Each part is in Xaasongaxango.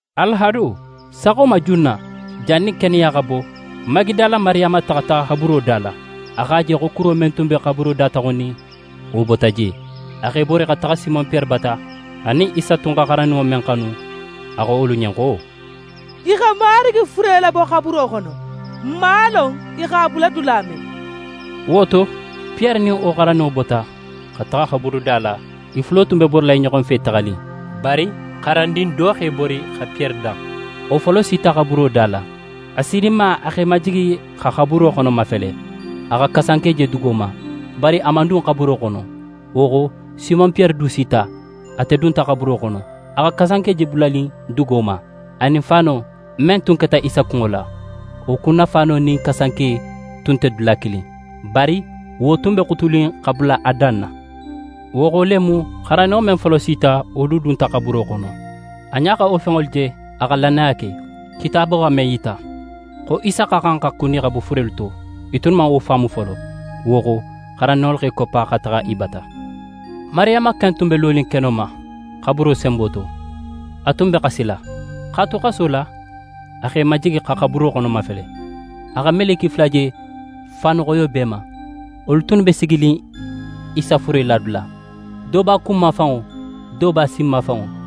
Alahado, saxo ma junna, jannin keneya xa bo, Magidala Mariyama taxata xaburo da la. A x'a je xo kuro men tun be xaburo dataxunnin, wo bota je. A x'é bori xa taxa Simon Piyere bata, anin Isa tun xa xarandinŋo men xanu. A xo wolu ɲen xo: «I xa Marigi fure labo xaburo xono. N man a lon i x'a bula dula men.» Wo to, Piyere nin wo xarandinŋo bota, xa taxa xaburuda la. I fulo tun b'e borila i ɲoxo fe taxanin. Bari xarandin do x'é bori xa Piyere dan. Wo folo sita xaburuda la. A sininma, a x'é majigi xa xaburo xono mafele, a xa kasanke je dugo ma, bari a man dun xaburo xono. Wo xo, Simon Piyere du sita, ate dunta xaburo xono, xa kasanke je bulanin dugo ma, anin faano, men tun keta Isa kunŋo la. Wo kunnafaano nin kasanke tun nte dula kilin. Bari wo tun be xutunin xa bula a dan na. Wo xo le mu, xarandinŋo men tun folo sita, wo du dunta xaburo xono. A ɲa xa wo fenŋolu je, a xa lannaya ke. Kitaabo xa men yita, xo Isa xa xan xa kuni xa bo furelu to, i tunnu man wo faamu folo. Wo xo, xarandinŋolu x'e koppa xa taxa i bata. Mariyama ken tun be lonin keno ma, xaburo senbo to. A tun be xasila. X'a tu xaso la, a x'é majigi xa xaburo xono mafele. A xa meleke fula je, faanu xoyo b'e ma. Wolu tunnu be siginin Isa fure ladula, do b'a kunmafanŋo, do b'a sinmafanŋo.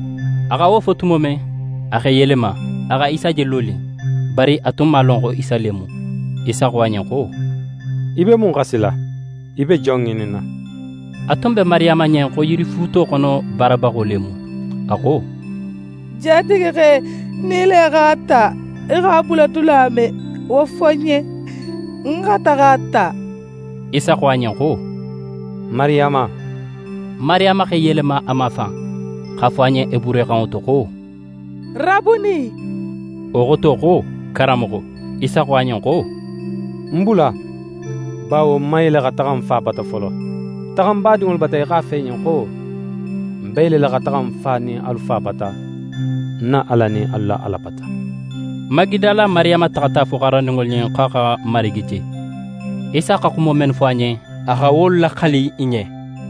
A xa wo fo tumo men, a x'é yelema, a xa Isa je lonin. Bari a tun man a lon xo Isa le mu. Isa xo a ɲen xo: «Í be mun xasila? Í be jon ŋininna?» A tun be Mariyama ɲen xo yirifuuto xono baarabaxo le mu. A xo: «Jatigixe, nin í le x'a ta, í x'a bula dula men, wo fo ń ɲen, ń xa taxa a ta.» Isa xo a ɲen xo: «Mariyama!» Mariyama x'é yelema a mafan x'a fo a ɲen heburuxanŋo to xo: «Rabuni!» Wo xoto xo: «Karanmoxo.» Isa xo a ɲen xo: «Ń bula, bawo ń man yele xa taxa ń Fa bata folo. Taxa ń badinŋolu bata í x'a fo i ɲen xo: Ń be yelela xa taxa ń Fa nin alu Fa bata, ń na Ala nin alu la Ala bata.» Magidala Mariyama taxata a fo xarandinŋolu ɲen, xo a xa Marigi je. Isa xa xumo mennu fo a ɲen, a xa wolu laxali i ɲen.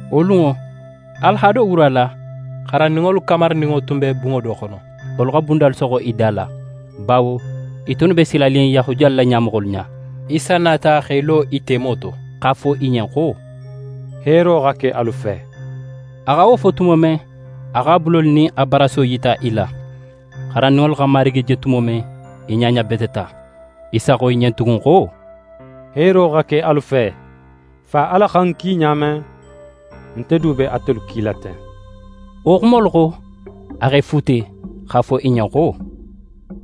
Wo lunŋo, alahado wura la, xarandinŋolu kamarininŋo tun be bunŋo do xono, wolu xa bundalu soxo i da la, bawo i tunnu be silanin Yahudiyalu la ɲamoxolu ɲa. Isa nata x'é lo i temo to, x'a fo i ɲen xo: «Heero xa ke alu fe.» A xa wo fo tumo men, a x'a bulolu nin a baraso yita i la. Xarandinŋolu xa Marigi je tumo men, i ɲaɲabeteta. Isa xo i ɲen tugun xo: «Heero xa ke alu fe! Fa Ala xa ń ki ɲa men, nte du be atelu kila ten.» Wo xumolu xo, a x'e fuute, x'a fo i ɲen xo: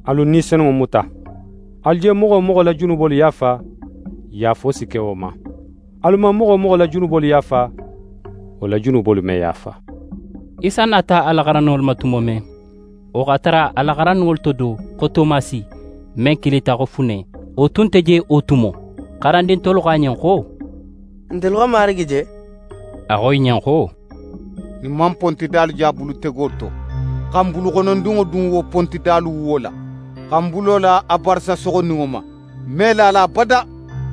«Alu Ni Senunŋo muta. Alu je moxo wo moxo la junubolu yaafa, yaafo si ke wo ma. Alu man moxo wo moxo la junubolu yaafa, wo la junubolu me yaafa.» Isa nata a la xarandinŋolu ma tumo men, wo x'a tara a la xarandinŋolu to do, xo Tomasi, men kilita xo Fune, wo tun nte je wo tumo. Xarandin tolu xo a ɲen xo: «Ntelu xa Marigi je.» A xo i ɲen xo: «Nin ń man pontidalu je a bulutego to, xa ń buluxonondinŋo dun wo pontidalu wuwo la, xa ń bulo la a barasa soxoninŋo ma, ń me la a la abada.»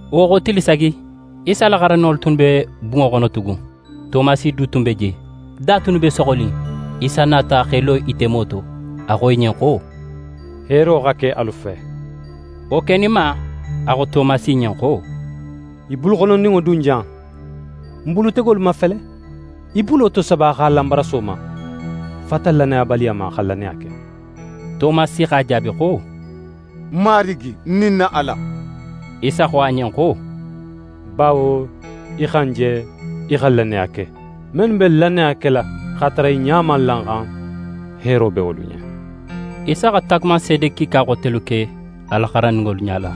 Wo xo tili sagi, Isa la xarandinŋolu tunnu be bunŋo xono tugun. Tomasi du tun be je. Da tunnu be soxonin. Isa nata x'e lo i temo to. A xo i ɲen xo: «Heero xa ke alu fe.» Wo keninma, a xo Tomasi ɲen xo: «Í buluxonondinŋo dun jan, ń bulutegolu mafele, í bulo tosaba x'a la ń baraso ma. Fata lannayabaliya ma, xa lannaya ke.» Tomasi x'a jaabi xo: «Ń Marigi nin ń na Ala.» Isa xo a ɲen xo: «Bawo í xa ń je, í xa lannaya ke! Mennu be lannaya kela x'a tara i ɲa man la ń xan, heero be wolu ɲen!» Isa xa taagumanseede kiika xotelu ke a la xarandinŋolu ɲala,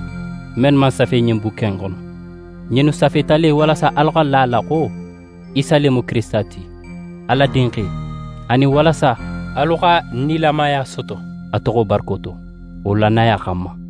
mennu man safe ɲin bukke in xono. Ɲinnu safeta le, walasa alu xa la a la xo Isa le mu Kirisita ti, Ala Dinxe; anin walasa alu xa nilamaya soto a toxo barako to, wo lannaya xanma.